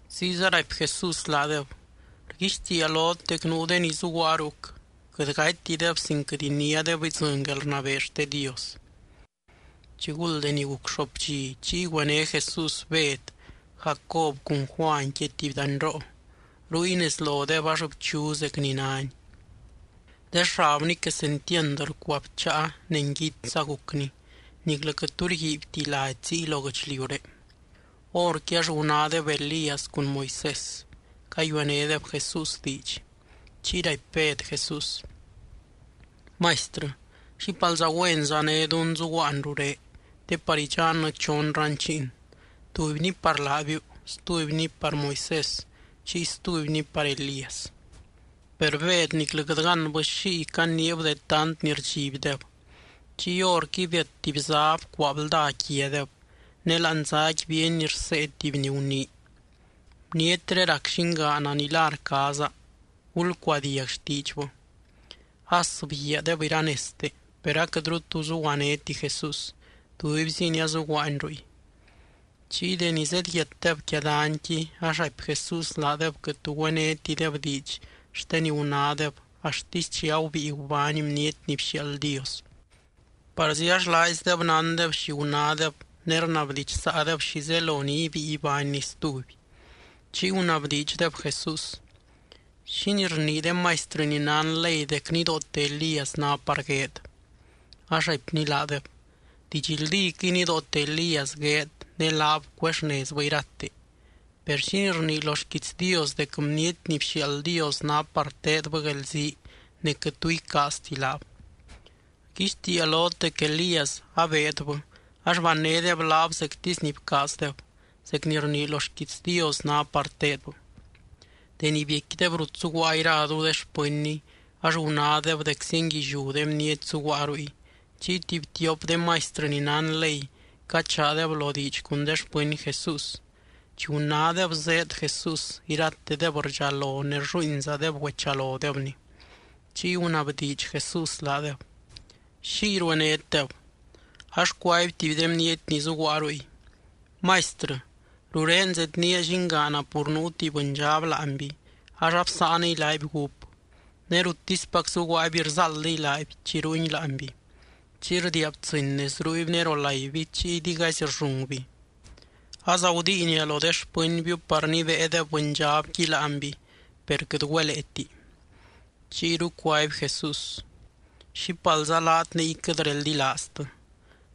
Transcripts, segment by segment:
Ziyza raipy Jesús laadeb: —Rguixtiia lot dec nuu de ni zuguaa ruc, quɨt gatytideb sin quɨt iniádeb idzɨny guelrnabee xte Dios. Chiguld deni guc xoop dxi, chiy güené Jesús Bed, Jacob cun Juany quia tuby danyroo, ruy nez lodeb ax bchu zec ni nány. De xabny quesentiand rcuabcháa ne nguitsza gucni, niclɨ quɨt tu rguiibyti lady ziy lo guɨchliuré. Horqui ax gunádeb Elías cun Moisés cayuenédeb Jesús diidx. Chiy raipy Bed Jesús: —Maistrɨ, ¡xípalza güenza né dunnɨ zuguaan rurén! Te par idxannɨ chon ranchiin, tubyni par laabiu, stubyni par Moisés, chiy stubyni par Elías. Per Bed niclɨ quɨt gánbɨ xiy caniib de tant ni rdxibdeb. Chiy horqui biat tuby zá bcuaa blda quiadeb. Ne láani záqui bíeny rsee tuby ni gunii: —Bnietré rac Llingaana ni la rcaaza. Gulcuadiag xtiidxbɨ. As bguiaadeb iranezte, per aquɨtru tu zuguanéti Jesús. Tubyziny azuguaany ruy. Chiy deni zedyiatdeb quia danyqui, ax raipy Jesús laadeb quɨt tu güénetideb diidx xte ni gunádeb axtisy chi agubíi gubány Bniety ni bxiaald Dios. Parzi ax laaizdeb nándeb xi gunádeb ne rnabdidxsaadeb xi zelo ni ibíi ibánny stuby. Chiy gunabdiidxdeb Jesús: —¿Xínii rnii de maistrɨ ni nán ley dec nidoote Elías ná par gueed? Ax raipny laadeb: —Didxldíquɨy nidoote Elías gueed ne laab cuexnezbɨ irate. Per, ¿xínii rnii lo xquiits Dios dec Bniety ni bxiaald Dios ná par teedbɨ guelzii ne quɨt tu icaazti laab? Rguixtiia lot dec Elías abeedbɨ ax bannédeb laab zectisy ni bcaazdeb, zec ni rnii lo xquiits Dios ná par teedbɨ. Deni biecquideb rut zuguaa iraru de xpɨnny ax gunádeb dec zienguilliú de bniety zuguaa ruy. Chiy tuby tiop de maistrɨ ni nán ley cachaadeb lo diidx cun de xpɨny Jesús. Chi gunádeb zéed Jesús, iratedeb rdxalo ne rlluuinzadeb güechalodebny. Chiy gunabdiidx Jesús laadeb: —¿Xiy ruenétdeb? Ax cuaby tuby de bniety ni zuguaa ruy: —Maistrɨ, rurén zednía llingaana pur nuu tuby bɨndxab láanby ax absáaniy laaby gúp. Ne ruttispac zuguaaby rzáaldiy laaby chi rungui láanby. Chiy rdiia btsɨ́ny nez ruuby ne rolaiby chiy digaizy rllungby. Azagudiinia lo de xpɨnbiu par nibéedeb bɨndxabqui láanby, per quɨt güeleeti. Chiyru cuaby Jesús: —¡Xípalza laat niy quɨt reldilaaztɨ!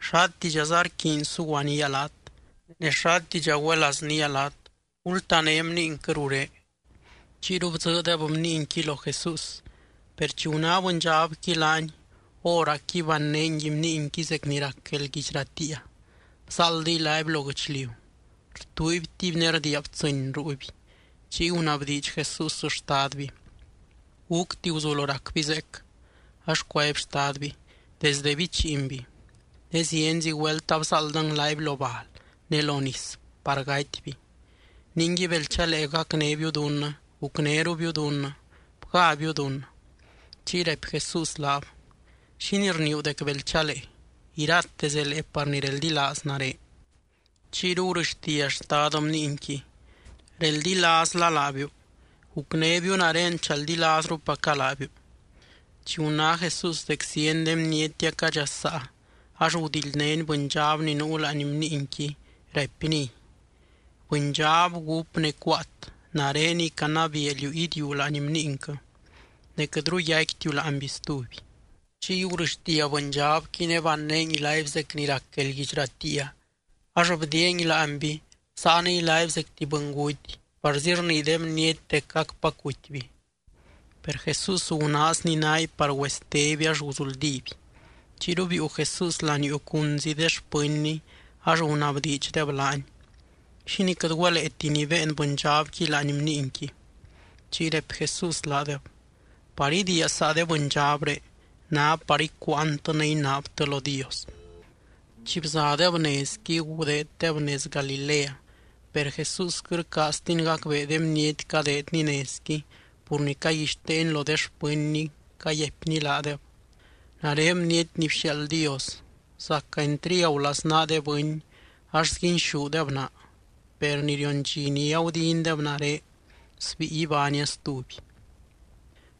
¿Xátidxaza rquiiny suguanía laat? ne, ¿xátidxa güelaaznía laat? Gultané bniinquɨ rurén. Chiyru bdzɨɨdeb bniinqui lo Jesús. Per chi guná bɨndxabqui laany, hóracqui bannéy bniinqui zec ni rac guelguidx ratiia. Bzáaldiy laaby lo guɨchliu, rtuuibtiby ne rdiia btsɨ́ny ruuby. Chiy gunabdiidx Jesús xtadby: —¿Gúcti guzulo racby zeec? Ax cuaby xtadby: —Desde bichiinby. Ne zienzi güelt abzáaldɨng laaby lo bal ne lo nis par gatyby. Ningui, bel chalee gacnébiu dunnɨ, gucnérubiu dunnɨ, bgábiu dunnɨ. Chiy raipy Jesús laab: —¿Xínii rniiu dec bel chalee? Irate zelee par ni reldilaaz nare. Chiyru gurɨxtia xtad bniinqui: —¡Reldilaazla laabiu, gucnébiu nare chaldilaazrupaca laabiu! Chi guná Jesús dec zieny de bniety acadxasaa ax gudildnény bɨndxab ni nuu láani bniinqui, raipniy: —Bɨndxab gúp ne cuaat, nareniy canabiia liú idiuu láani bniinquɨ. Ne quɨtru yaicquitiu láanby stuby. Chiy gurɨxtia bɨndxabqui ne bannéngui laaby zec ni rac guelguidx ratiia. Ax bdiiangui láanby, bsáaniy laaby zec tuby bɨnguty parzi rnii de bniety dec acpac gutyby. Per Jesús gunaazny naaby par güesteby ax guzuldíby. Chiyru biiu Jesús laniuu cunzi de xpɨnny, ax gunabdiidxdeb laany: —¿Xínii quɨt güeleeti nibéen bɨndxabqui láani bniinqui? Chiy raipy Jesús laadeb: —Par idiia saa de bɨndxabré ná par icuuantɨ ne inaabtɨ lo Dios. Chi bzadeb nezqui gudeeddeb nez Galilea. Per Jesús quɨt rcaaztiny gacbee de bniety cadeedny nezqui pur ni caguixteeny lo de xpɨnny, cayaipny laadeb: —Nare Bniety ni bxiaald Dios, zaca entriagu laznaa de bɨny ax sguinxúdeb naa. Per ni rion dxi ni agudindeb nare, sbíi ibánia stuby.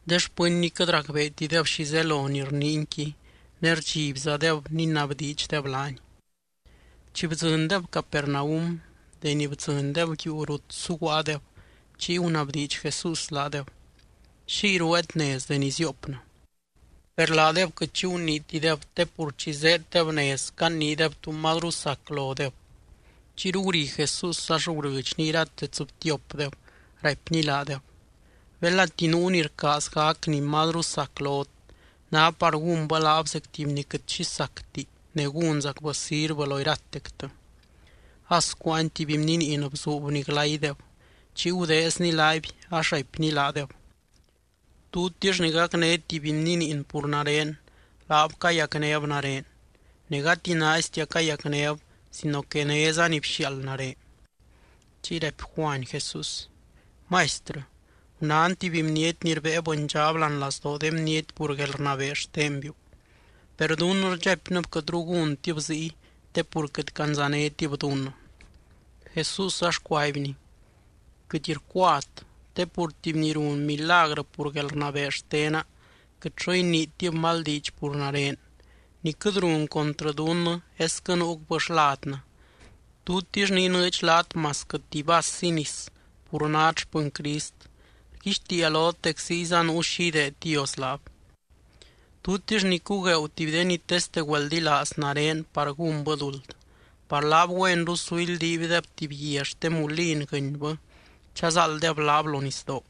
De xpɨnny quɨt racbeetideb xi zelo ni rniinyqui ne rdxibzadeb ninabdiidxdeb laany. Chi bdzɨndeb Capernaum, deni bdzɨndeb yuu rut suguaadeb, chiy gunabdiidx Jesús laadeb: —¿Xiy rueet nez deni zioopnɨ? Per laadeb quɨt xi guniitideb, te pur chi zéeddeb nez caniideb tu mazru sac lodeb. Chiyru guri Jesús ax gurɨdxny irate tsɨbtiopdeb, raipny laadeb: —Belati nuu ni rcaaz gac ni mazru sac lot, ná par gúnbɨ laab zec tuby ni quɨt xi sacti ne gúnzacbɨ sirvɨ lo iratectɨ. As cuáany tuby bniniin bzuubny glaydeb, chiy gudeezny laaby ax raipny laadeb: —Tutix ni gacné tuby bniniin pur nare, laab cayacnéb nare, ne gati naaistia cayacnéb sino que néza ni bxiaald nare. Chiy raipy Juany Jesús: —Maistrɨ, gunán tuby bniety ni rbée bɨndxab láani lazdoo de bniety pur guelrnabee xtenbiu. Per dunnɨ rdxaipnɨb quɨtru gúntib ziy te pur quɨt candzanétib dunnɨ. Jesús ax cuaibny: —Quɨt rcuat, te pur tuby ni run milagrɨ pur guelrnabee xtena quɨt xo iniitib mal diidx pur nare. Ni quɨt run contrɨ dunnɨ esquɨ nuucbɨ xladnɨ. Tutix ni inɨɨdx laat masquɨ tuby vassi nis pur nát xpɨny Crist, rguixtiia lot dec ziyza zuu xi ideed Dios laab. ’Tutix ni cugueeu tuby de ni teste güeldilaaz nare par gúnbɨ duld, par laab güenru su ildiibdeb tuby guia xte mulin guɨnybɨ chazáalddeb laab lo nisdoo.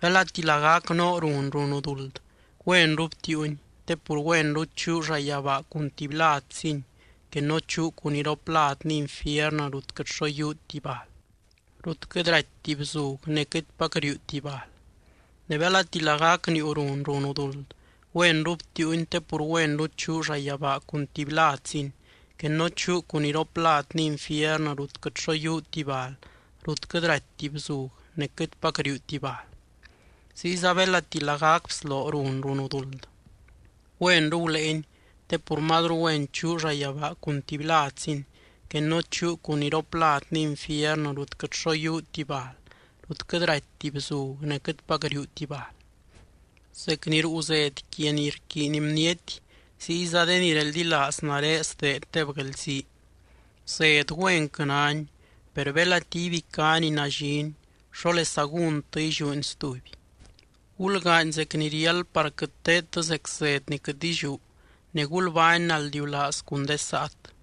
Belati lagac noo run runu duld, güenru btiiuni te pur güenru chuu llayabaa cun tuby ladzini que no chuu cun iropladni infiernɨ rut quɨt xo yiuuti bal, rut quɨt ratyti bzug ne quɨtpac riuuti bal. Ne belati lagac niiu run runu duld, güenru btiiuni te pur güenru chuu llayabaa cun tuby ladzini que no chuu cun iropladni infiernɨ rut quɨt xo yiuuti bal, rut quɨt ratyti bzug ne quɨtpac riuuti bal. Ziyza belati lagac bsloo run runu duld, güenru guléeny te pur mazru güen chuu llayabaa cun tuby ladzini que no chuu cun iropladni infiernɨ rut quɨt xo yiuuti bal, rut quɨt ratyti bzug ne quɨtpac riuuti bal. ’Zec ni ruu zed quia ni rquiiny bniety, ziyza de ni reldilaaz nare sdeeddeb guelzii. Zed güenquɨ náni. Per belati ibicá ni nallini, ¿xólesa gúntɨ illiúni stuby? Gulgaany zec ni riáld par quɨt teedtɨ zec zed ni quɨt illiú ne gulbány naldiulaaz cun de saat.